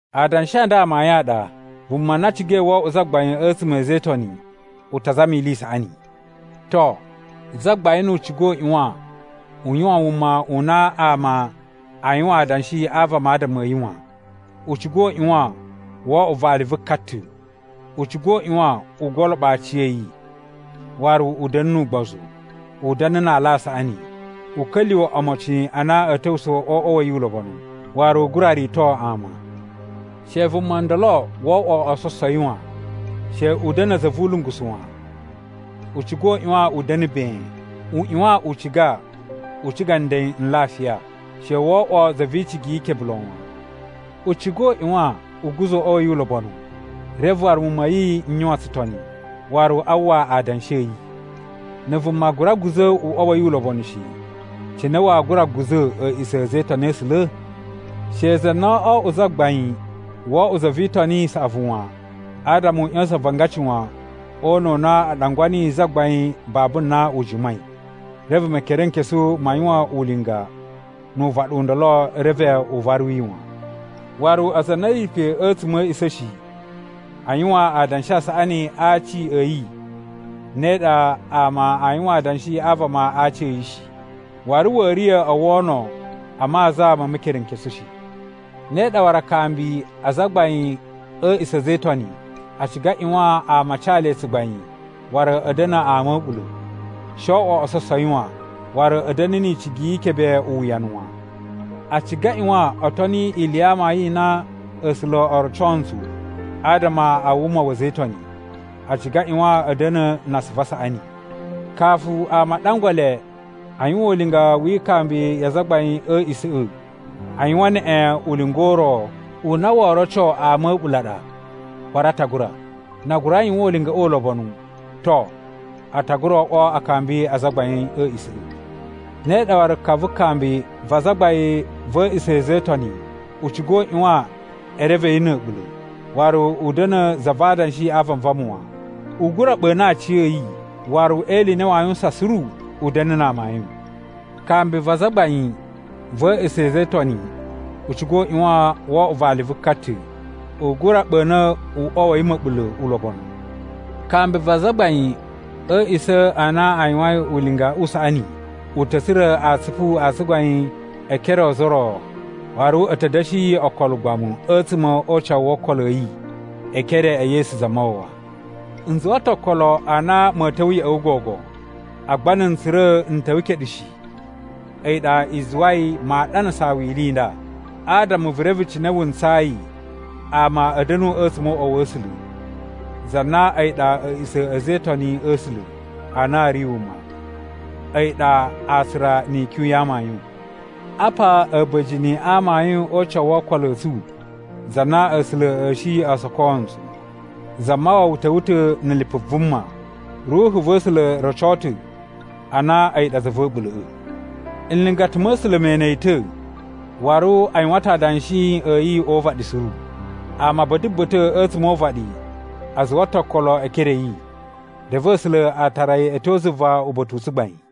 Adanshi a nda amayun a ɗa: Vuma na cigai wo oꞌwo zagbain a̱tsuma̱ a̱ a̱za̱ e Itoni, u ta zama ili i saꞌani. To, zagbain nu u ciga u ꞌyuwan u yuwan wuma u na ama aa yuwan adanshi a vama adama a̱ yi wan. U ciga u ꞌyuwan woo oꞌwo vali vu ka ta̱. U ciga u ꞌyuwan u goloɓo aciya̱yi, waru u da̱na̱ nu ugbozu. U da̱na̱ na ala a saꞌani. U ka̱lyuwa̱ omocin a na a̱ ta̱wusa̱ o uꞌwa wa̱ yi ulobonu, waru u gura rito ama. She vuma ndolo wo oꞌwo ososowi wan, she u da̱na̱ za vu ulungusu wan. U ciga u ꞌyuwan u da̱na̱ ben. U ꞌyuwan u ciga u ciga nden n lafiya. She wo oꞌwo za vi icigi yi ikebe lon wan. U ciga u ꞌyuwan u guza̱ uꞌwa yi ulobonu, reve waru muwun ma̱ yi n yuwan tsutoni, waru a uwwa adanshi a̱ yi. Na̱ vuma gura guza̱ uꞌwa wa̱ yi ulobonu shi, cine waa gura guza̱ a̱a̱ꞌisa̱ a̱ a̱za̱ e Itoni a̱ A̱sula̱? She za na oo oꞌwo zagbain wo oꞌwo za vi Itoni i saꞌavu wan, adama u ꞌya̱sa̱n avangaci wan o una̱ u na a ɗangwa niyi zagbain babu na u jimai, reve Mekerenkesu ma yuwan ulinga nu uvaɗu u ndolo reve u varu yi wan. Waru aza a na a̱ ri pe a̱tsuma̱ a̱ a̱a̱ꞌisa̱ꞌa̱ shi a yuwan adanshi a saꞌani a aci a̱ yi ne ɗa ama a yuwan adanshi a vama a aci a̱ yi shi, waru wa̱a̱ riya̱ o wono a maza ma Mekerenkesu shi. Ne ɗa waru akambi a azagbain a̱ a̱a̱ꞌisa̱ a̱ a̱za̱ e Itoni a ciga a ꞌyuwan ama a ca le tsugbain waru a̱ da̱na̱ ama a̱ a̱ɓula̱. She oo oꞌwo ososowi wan, waru a̱a̱ da̱na̱ ni icigi yi ikebe uwuyanu wan. A ciga a ꞌyuwan o toni ili ya amayun i na A̱sula̱ o roco ntsu adama a wuma wa̱ a̱za̱ e Itoni. A ciga a ꞌyuwan a̱ da̱na̱ na asuvu a saꞌani. Kafu ama a ɗangwa le a yuwan ulinga wi ikambi ya azagbain a̱ a̱a̱ꞌisa̱ꞌa̱, a yuwan neꞌen ulinga u ro u na woo roco ama a̱ a̱ɓula̱ ɗa waru a ta gura. Na a gura yuwan ulingaꞌa ulobonu, to, a ta gura oꞌwo akambi a azagbain a̱ a̱a̱ꞌisa̱ꞌa̱. Ne ɗa waru ka vu kambi va azagbain va̱ a̱a̱ꞌisa̱ a̱ a̱za̱ e Itoni u ciga u ꞌyuwan e reve yi na̱ a̱ɓula̱, waru u da̱na̱ za va adanshi a vanvama wan. U gura ɓa̱na̱ aciya̱yi waru e ili i na waa yuwusan suru, u da̱na̱ na amayun. Kambi va azagbain va̱ a̱a̱ꞌisa̱ a̱ a̱za̱ e Itoni u ciga u ꞌyuwan wo oꞌwo vali vu ka ta̱. U gura ɓa̱na̱ uꞌwa wa̱ yi ma̱ɓula̱ ulobonu. Kambi va azagbain a̱ a̱a̱ꞌisa̱ a na a yuwain ulinga u saꞌani u ta̱ tsura̱ atsupu a tsugbain e ekere o ozo o ro waru a̱ ta̱ da̱shi yi okolo ugbamu a̱tsuma̱ o ucawu wo okolo a̱ yi e ekere e Yesu Zamawawa. N zuwa ta̱ okolo a na ma̱a̱ ta̱wa̱ ya̱ꞌa̱ wu gogo. Agba na̱ n tsura̱ n ta̱wa̱ keɗu shi, a̱yi ɗa i zuwai maa ɗanasaa wu ili i nda, adama vu reve cine wu ntsayi ama a̱ da̱nu a̱tsuma̱ o uꞌwa wa̱ A̱sula̱. Za na a̱yi ɗa a̱a̱ꞌisa̱ a̱ a̱za̱ e Itoni a̱ A̱sula̱ a na a̱ ri wuma, a̱yi ɗa atsura ni ikyun ya amayun. Apa a̱ba̱jini a amayun o ucawu wo okolo a̱ tsu za na A̱sula̱ a̱ shi o soko ntsu: Zamawawa ta̱wa̱ ta̱ na̱ lipu vuma, Ruhu va̱ A̱sula̱ roco ta̱ a na a̱yi ɗa Za va̱ a̱ɓula̱ꞌa̱. Nlingata ma̱ A̱sula̱ me ene yi ta̱, waru a yuwan ta̱ adanshi a̱ yi o uvaɗi suru. Ama ba̱ta̱ ba̱ta̱ a̱tsuma̱ o uvaɗi a zuwa ta̱ okolo e ekere a̱ yi, reve A̱sula̱ a tara yi a̱ tyo zuva uba̱ta̱ u tsugbain.